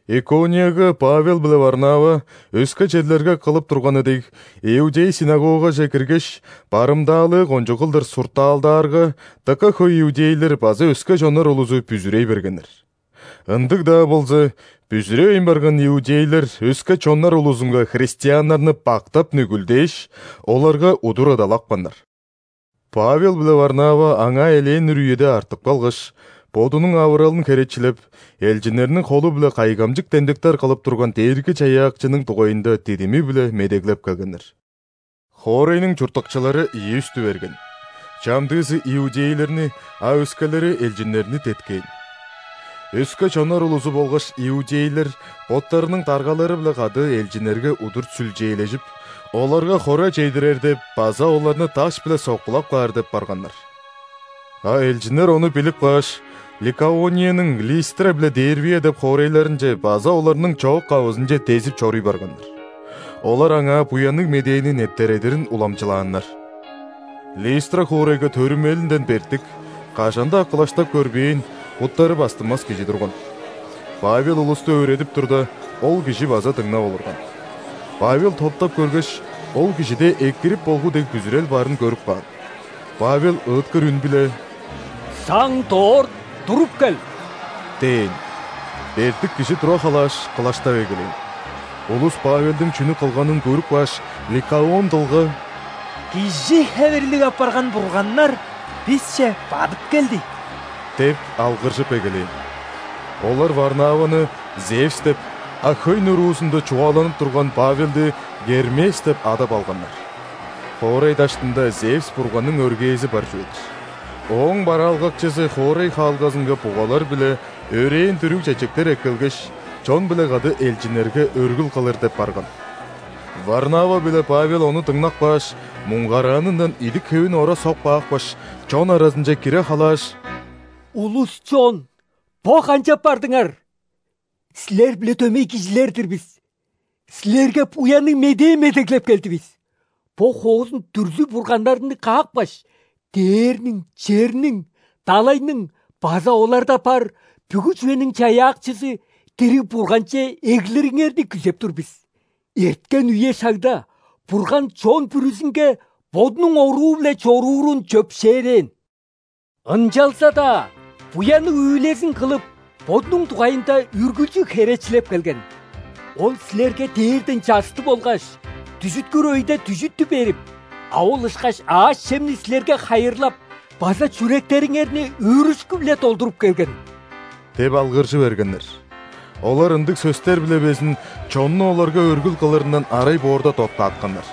Иконияга Павел биле Варнава, өске черлерге кылып турганы дег, иудей ·синагогаже киргеш, барымдаалыы кончуг кылдыр суртаалдаарга, дыка хөй иудейлер база өске чоннар улузу бүзүрей бергеннер. Ындыг-даа болза, бүзүревейн барган иудейлер өске чоннар улузунга христианнарны бактап, нүгүлдээш, оларга удур ыдалапканнар. Павел биле Варнава аңаа элээн үр үеде артып калгаш, Бодунуң авыралын херечилеп, элчиннерниң холу-биле кайгамчык демдектер кылып турган Дээрги-Чаяакчының дугайында дидими-биле медеглеп келгеннер. Хоорайның чурттакчылары ийи үстү берген: чамдыызы иудейлерни, а өскелери элчиннерни деткээн. Өске чоннар улузу болгаш иудейлер боттарының даргалары-биле кады элчиннерге удур сүлчээлежип, оларга хора чедирер деп база оларны даш-биле соккулап каар деп барганнар. А элчиннер ону билип кааш, Ликаонияның Листра биле Дервия деп хоорайларынче база оларның чоок-кавызынче дезип чоруй барганнар. Олар аңаа Буянныг Медээни нептередирин уламчылааннар. Листра хоорайга төрүмелинден бертик, кажан-даа кылаштап көрбээн, буттары бастынмас кижи турган. Павел улусту өөредип турда, ол кижи база дыңнап олурган. Павел топтап көргеш, ол кижиде экирип болгу дег бүзүрел барын көрүп каан. Павел ыыткыр үн-биле: «Саң дорт туруп кел!» – дээн. Бертик кижи тура халааш, кылаштап эгелээн. Улус Павелдиң чүнү кылганын көрүп кааш, ликаон дылга: «Кижи хевирлиг апарган бурганнар бисче бадып келди!» – деп алгыржып эгелээн. Олар Варнаваны Зевс деп, а хөй нуруузунда чугааланып турган Павелди Гермес деп адап алганнар. Хоорай даштында Зевс бурганның өргээзи бар чүве-дир. Ооң бараалгакчызы хоорай хаалгазынга бугалар биле өрээн дүрүг чечектер эккелгеш, чон-биле кады элчиннерге өргүл кылыр деп барган. Варнава биле Павел ону дыңнап кааш, муңгараанындан идик-хевин ора соп каапкаш, чон аразынче кире халааш: «Улус-чон! Бо канчап бардыңар? Силер-биле дөмей кижилер-дир бис! Силерге Буянныг Медээ медеглеп келдивис. Бо хоозун дүрзү-бурганнарны каапкаш, дээрниң, черниң, далайның база оларда бар бүгү чүвениң Чаяакчызы, дириг Бурганче эглириңерни күзеп тур бис. Эрткен үе-шагда Бурган чон бүрүзүнге бодунуң оруу-биле чоруурун чөпшээрээн. Ынчалза-даа буянныг үүлезин кылып, Бодунуң дугайында үргүлчү херечилеп келген. Ол силерге дээрден чаъсты болгаш дүжүткүр өйде дүжүттү берип, а ол ышкаш аъш-чемни силерге хайырлап база чүректериңерни өөрүшкү-биле долдуруп келген» – деп алгыржы бергеннер. Олар ындыг сөстер-биле безин чонну оларга өргүл кылырындан арай боорда доктаатканнар.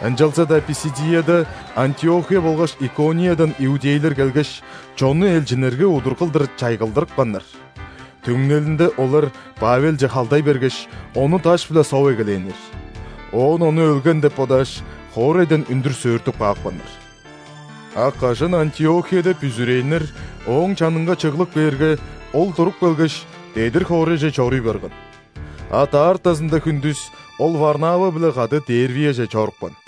Ынчалза-даа Писидияда Антиохия болгаш Икониядан иудейлер келгеш, чонну элчиннерге удур кылдыр чайгылдырыпканнар. Түңнелинде олар Павелче халдай бергеш, ону даш-биле соп эгелээннер. Оон ону өлген деп бодааш, хоорайдан үндүр сөөртүп каапканнар. А кажан Антиохияда бүзүрээннер ооң чанынга чыглып кээрге, ол туруп келгеш, дедир хоорайже чоруй барган. А даартазында хүндүс ол Варнава-биле кады Дервияже чорупкан.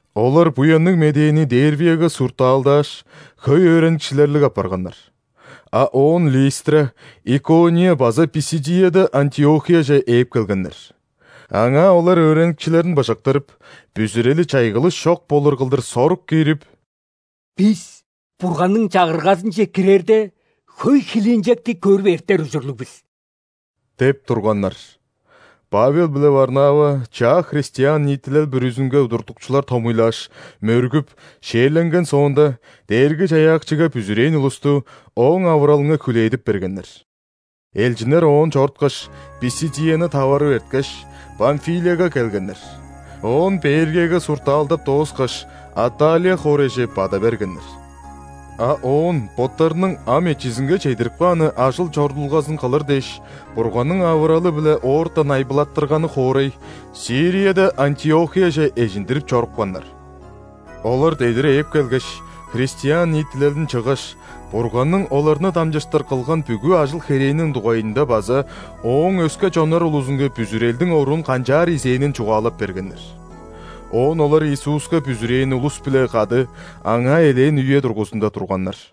Олар Буянныг Медээни Дервияга суртаалдааш, хөй өөреникчилерлиг апарганнар. А оон Листра, Икония база Писидияда Антиохияже ээп келгеннер. Аңаа олар өөреникчилерин быжыктырып, бүзүрели чайгылыш чок болур кылдыр сорук киирип: «Бис Бурганның Чагыргазынче кирерде, хөй хилинчекти көрүп эртер ужурлуг бис» – деп турганнар. Павел биле Варнава чаа христиан ниитилел бүрүзүнге удуртукчулар томуйлааш, мөргүп, ·шээрленген соонда, Дээрги-Чаяакчыга бүзүрээн улусту Ооң авыралынга хүлээдип бергеннер. Элчиннер оон чоруткаш, Писидияны таварып эрткеш, Памфилияга келгеннер. Оон Пергияга суртаалдап дооскаш, Атталия хоорайже бада бергеннер. А оон боттарының ам эчизинге чедирип кааны ажыл-чорудулгазын кылыр дээш, Бурганның авыралы-биле оортан айбылаттырганы хоорай – Сирияда Антиохияже эжиндирип чорупканнар. Олар дедир ээп келгеш, христиан ниитилелин чыггаш, Бурганның оларны дамчыштыр кылган бүгү ажыл-херээниң дугайында база Ооң өске чоннар улузунга бүзүрелдиң оруун канчаар изээнин чугаалап бергеннер. Оон олар Иисуска бүзүрээн улус-биле кады аңаа элээн үе дургузунда турганнар.